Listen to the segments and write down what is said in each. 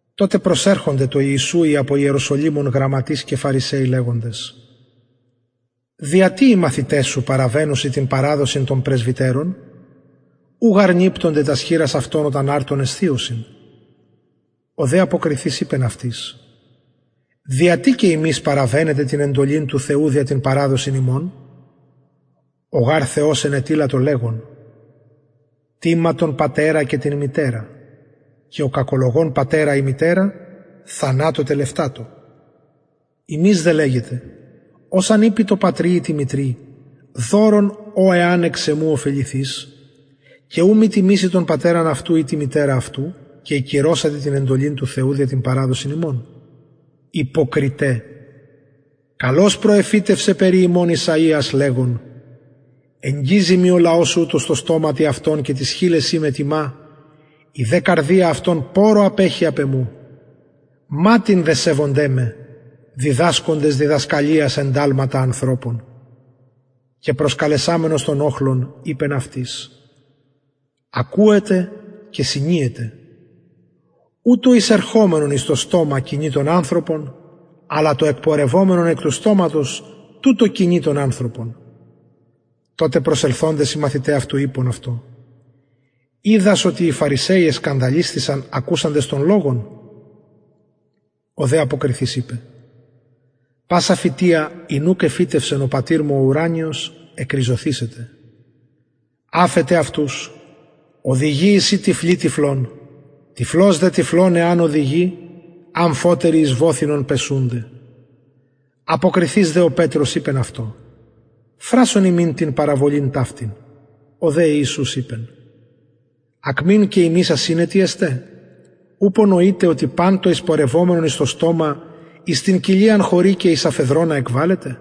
τοτε προσερχονται τω ιησου οι απο ιεροσολυμων γραμματεις και φαρισαιοι λεγοντες δια τι οι μαθηται σου παραβαινουσιν την παραδοσιν των πρεσβυτερων ου γαρ νιπτονται τας χειρας αυτων οταν αρτον εσθιωσιν ο δε αποκριθεις ειπεν αυτοις δια τι και υμεις παραβαινετε την εντολην του θεου δια την παραδοσιν υμων ο γαρ θεος ενετειλατο λεγων τιμα τον πατερα και την μητερα και ο κακολογων πατερα η μητερα θανατω τελευτατω υμεις δε λεγετε ος αν ειπη τω πατρι η τη μητρι δωρον ο εαν εξ εμου ωφεληθης και ου μη τιμηση τον πατερα αυτου η την μητερα αυτου και ηκυρωσατε την εντολην του θεου δια την παραδοσιν υμων υποκριται καλως προεφητευσεν περι υμων ησαιας λεγων εγγιζει μοι ο λαος ουτος τω στοματι αυτων και τοις χειλεσιν με τιμα η δε καρδια αυτων πορρω απεχει απ εμου ματην δε σεβονται με διδασκοντες διδασκαλιας ενταλματα ανθρωπων και προσκαλεσαμενος τον οχλον ειπεν αυτοις ακουετε και συνιετε ου το εισερχομενον εις το στομα κοινοι τον ανθρωπον αλλα το εκπορευομενον εκ του στοματος τουτο κοινοι τον ανθρωπον τοτε προσελθοντες οι μαθηται αυτου ειπον αυτω οιδας οτι οι φαρισαιοι ακουσαντες τον λογον εσκανδαλισθησαν ο δε αποκριθεις ειπεν πασα φυτεια ην ουκ εφυτευσεν ο πατηρ μου ο ουρανιος εκριζωθησεται αφετε αυτους οδηγοι εισιν τυφλοι τυφλων τυφλος δε τυφλον εαν οδηγη αμφοτεροι εις βοθυνον πεσουνται αποκριθεις δε ο πετρος ειπεν αυτω φρασον ημιν την παραβολην ταυτην ο δε ιησους ειπεν ακμην και υμεις ασυνετοι εστε ουπω νοειτε οτι παν το εισπορευομενον εις το στομα εις την κοιλιαν χωρει και εις αφεδρωνα εκβαλλεται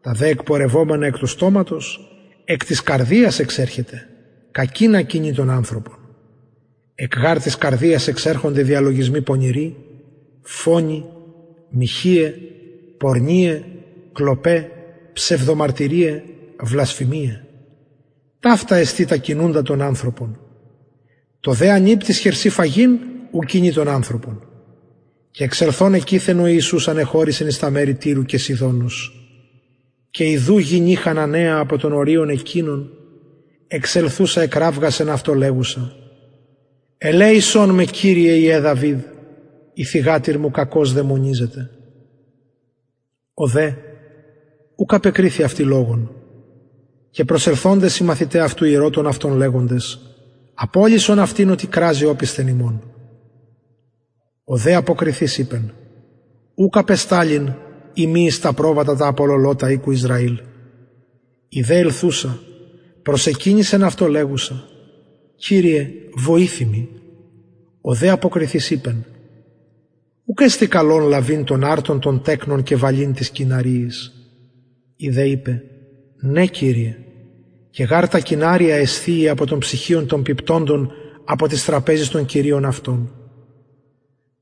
τα δε εκπορευομενα εκ του στοματος εκ της καρδιας εξερχεται κακεινα κοινοι τον ανθρωπον εκ γαρ της καρδιας εξερχονται διαλογισμοι πονηροι φονοι μοιχειαι πορνειαι κλοπαι ψευδομαρτυριαι βλασφημιαι ταυτα εστιν τα κοινουντα τον ανθρωπον το δε ανιπτοις χερσιν φαγειν ου κοινοι τον ανθρωπον και εξελθων εκειθεν ο ιησους ανεχωρησεν εις τα μερη τυρου και σιδωνος και ιδου γυνη χαναναια απο των οριων εκεινων εξελθουσα εκραυγασεν αυτω λεγουσα ελεησον με κυριε υιε δαυιδ η θυγατηρ μου κακως δαιμονιζεται ο δε ουκ απεκριθη αυτη λογον και προσελθοντες οι μαθηται αυτου ηρωτων αυτον λεγοντες απολυσον αυτην οτι κραζει οπισθεν ημων ο δε αποκριθεις ειπεν ουκ απεσταλην ει μη εις τα προβατα τα απολωλοτα οικου ισραηλ η δε ελθουσα προσεκυνησεν αυτω λεγουσα κυριε βοηθει μοι ο δε αποκριθεις ειπεν ουκ εστιν καλον λαβειν τον αρτον των τεκνων και βαλειν τοις κυναριοις η δε ειπεν ναι κυριε και γαρ τα κυναρια εσθιει απο των ψιχιων των πιπτοντων απο της τραπεζης των κυριων αυτων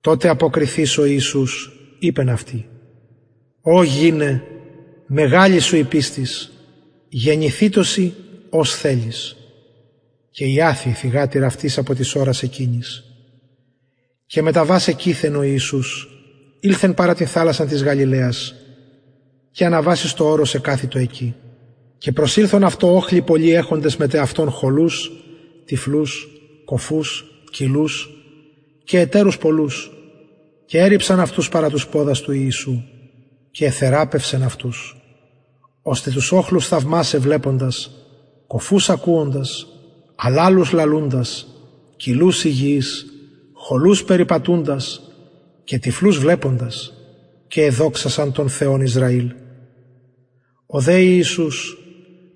τοτε αποκριθεις ο ιησους ειπεν αυτη ω γυναι μεγαλη σου η πιστις γενηθητω σοι ως θελεις και ιαθη η θυγατηρ αυτης απο της ωρας εκεινης και μεταβας εκειθεν ο ιησους ηλθεν παρα την θαλασσαν της γαλιλαιας και αναβας εις το ορος εκαθητο εκει και προσηλθον αυτω οχλοι πολλοι εχοντες μεθ εαυτων χωλους τυφλους κωφους κυλλους και ετερους πολλους και ερριψαν αυτους παρα τους ποδας του ιησου και εθεραπευσεν αυτους ωστε τους οχλους θαυμασαι βλεποντας κωφους λαλουντας κυλλους υγιεις χωλους περιπατουντας και τυφλους βλεποντας και εδοξασαν τον θεον ισραηλ ο δε ιησους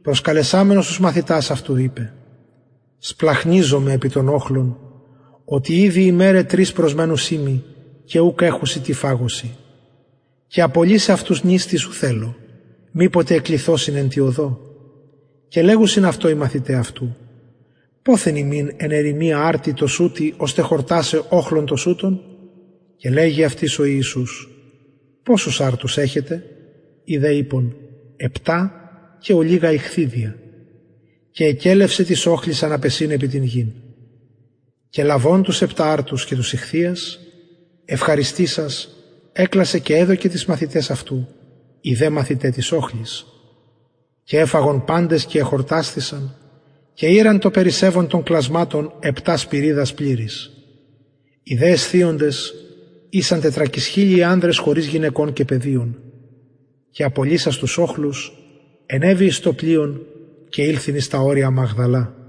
προσκαλεσαμενος τους μαθητας αυτου ειπεν σπλαγχνιζομαι επι τον οχλον οτι ηδη ημεραι τρεις προσμενουσιν μοι και ουκ εχουσιν τι φαγωσιν και απολυσαι αυτους νηστεις ου θελω μηποτε εκλυθωσιν εν τη οδω και λεγουσιν αυτω οι μαθηται αυτου ποθεν ημιν εν ερημια αρτοι τοσουτοι ωστε χορτασαι οχλον τοσουτον και λεγει αυτοις ο ιησους ποσους αρτους εχετε οι δε ειπον επτα και ολιγα ιχθυδια και εκελευσεν τοις οχλοις αναπεσειν επι την γην και λαβων τους επτα αρτους και τους ιχθυας ευχαριστησας εκλασεν και εδωκεν τοις μαθηταις αυτου οι δε μαθηται τω οχλω και εφαγον παντες και εχορτασθησαν και ηραν το περισσευον των κλασματων επτα σπυριδας πληρεις οι δε εσθιοντες ησαν τετρακισχιλιοι ανδρες χωρις γυναικων και παιδιων και απολυσας τους οχλους ενεβη εις το πλοιον και ηλθεν εις τα ορια μαγδαλα